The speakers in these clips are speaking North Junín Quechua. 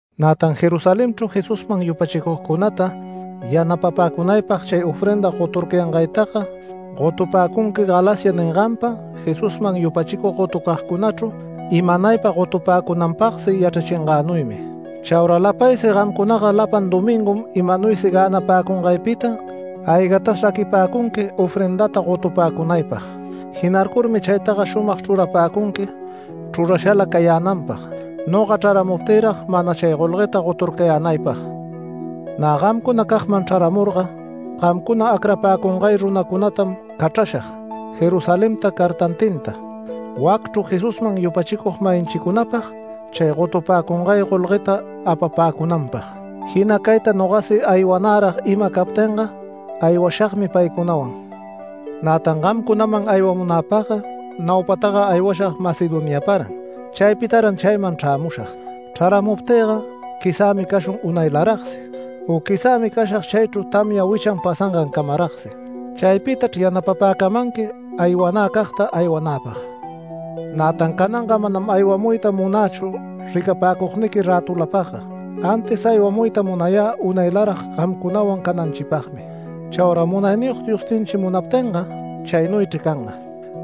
Nätan Jerusalenchru Jesusman yupachicugcunata yanapapäcunaypag chay ofrenda goturcayangaytaga gotupäcunqui Galacia ninganpa Jesusman yupachicug gotucagcunachru imanaypa gotupäcunanpagsi yachrachingänuymi. Chaura lapaysi gamcunaga lapan domingum imanuysi gänapäcungaypita aygatas raquipäcunqui ofrendata gotupäcunaypag. Jinarcurmi chaytaga shumag chrurapäcunqui chrurashala cayänanpag, noga chraramuptïrag mana chay golgueta goturcayänaypag. Nä gamcunacagman chraramurga gamcuna acrapäcungay runacunatam cachrashag Jerusalenta cartantinta, wacchru Jesusman yupachicug-mayinchicunapag, chay gotupäcungay golgueta apapäcunanpag. Jinacayta nogasi aywanärag ima captinga, aywashagmi paycunawan. Nätan gamcunaman aywamunäpagga naupataga aywashag Macedoniaparan. Chaypitaran chayman chrämushag. Chraramuptïga quizämi cashun unaylaragsi u quizämi cashag chaychru tamya wichan pasangancamaragsi. Chaypitachr yanapapäcamanqui aywanäcagta aywanäpag. Nätan cananga manam aywamuyta munächu ricapäcugniqui rätulapagga, antis aywamuyta munayä unaylarag gamcunawan cananchipagmi. Chaura Munayniyog Diosninchi munaptinga chaynuychri canga.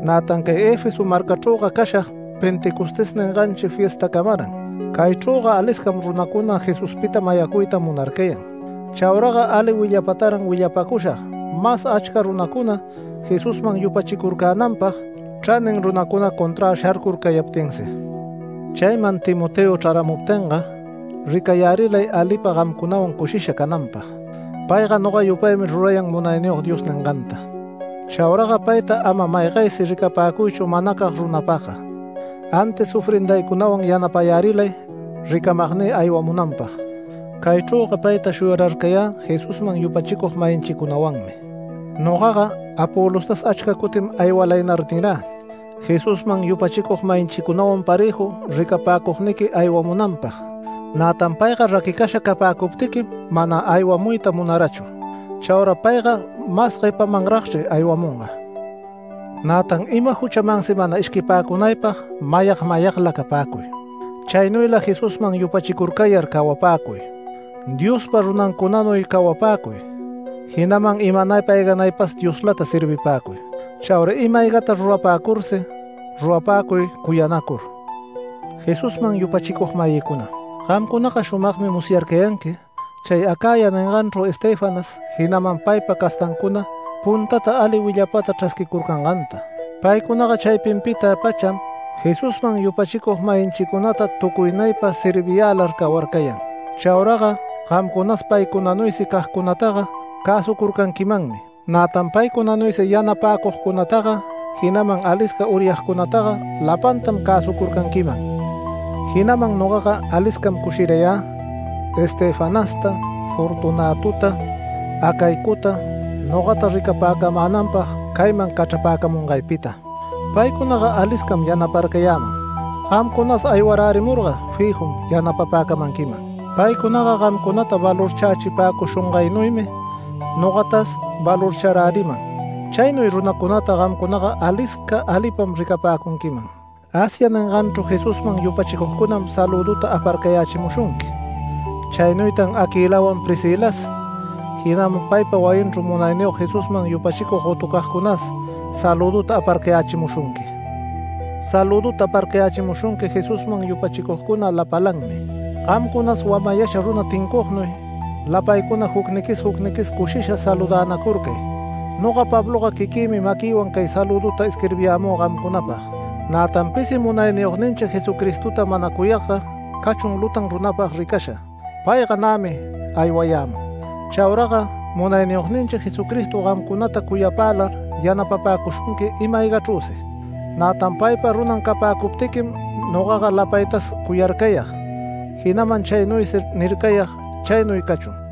Nätan cay Efeso marcachrüga cashag ‘Pentecostés’ ninganchi fiestacamaran. Caychrüga aliscam runacuna Jesuspita mayacuyta munarcayan. Chauraga ali willapataran willapäcushag mas achca runacuna Jesusman yupachicurcänanpag, chranin runacuna conträ sharcurcayaptinsi. Chayman Timoteo chraramuptinga ricayärilay alipa gamcunawan cushisha cananpag. Payga noga yupaymi rurayan Munayniyog Dios ninganta. Chauraga payta ama maygaysi ricapäcuychu manacag runapagga, antis ofrendaycunawan yanapayärilay ricamagnï aywamunanpag. Caychrüga payta shuyararcayä Jesusman yupachicug-mayinchicunawanmi. Nogaga Apolostas achca cutim “Aywalaynar” nirä, Jesusman yupachicug-mayinchicunawan parëju ricapäcugniqui aywamunanpag. Nätan payga raquicasha capäcuptiquim mana aywamuyta munarachu. Chaura payga mas guepamanragchri aywamunga. Nätan ima juchamansi mana ishquipäcunaypag mayag mayagla capäcuy. Chaynuyla Jesusman yupachicurcayar cawapäcuy. Diospa runancunanuy cawapäcuy, jinaman imanaypa ayganaypas Dioslata servipäcuy. Chaura ima-aygata rurapäcursi rurapäcuy cuyanacur. Jesusman yupachicug-mayïcuna, gamcunaga shumagmi musyarcayanqui chay Acaya ninganchru Estéfanas, jinaman paypa castancuna puntata ali willapata chrasquicurcanganta. Paycunaga chaypinpita-pacham Jesusman yupachicug-mayinchicunata tucuynaypa serviyälar cawarcayan. Chauraga gamcunas paycunanuysi cagcunataga cäsucurcanquimanmi. Nätan paycunanuysi yanapäcugcunataga, jinaman alisca uryagcunataga, lapantam cäsucurcanquiman. Jinaman nogaga aliscam cushirayä Estefanasta, Fortunatota, Acaicota nogata ricapäcamänanpag cayman cachrapäcamungaypita. Paycunaga aliscam yanaparcayäman, gamcunas aywarärimurga fijun yanapapäcamanquiman. Paycunaga gamcunata valorchächipäcushungaynuymi nogatas valorcharäriman. Chaynuy runacunata gamcunaga alisca alipam ricapäcunquiman. Asia ninganchru Jesusman yupachicugcunam salüduta aparcayächimushunqui. Chaynuytan Aquilawan Priscilas, jinaman paypa wayinchru Munayniyog Jesusman yupachicug gotucagcunas salüduta aparcayächimushunqui. Salüduta aparcayächimushunqui Jesusman yupachicugcuna lapalanmi. Gamcunas wamayasha runa tincugnuy lapaycuna jucniquis jucniquis cushisha saludänacurcay. Noga Pabloga quiquïmi maquïwan cay salüduta isquirbiyämü gamcunapag. Nätan pisi Munayniyogninchi Jesucristota mana cuyagga cachun lutan runapag ricasha. Payga nämi aywayämun. Chauraga Munayniyogninchi Jesucristo gamcunata cuyapälar yanapapäcushunqui ima-aygachrüsi. Nätan paypa runan capäcuptiquim nogaga lapaytas cuyarcayag, jinaman chaynuysi nircayag. Chaynuy cachun.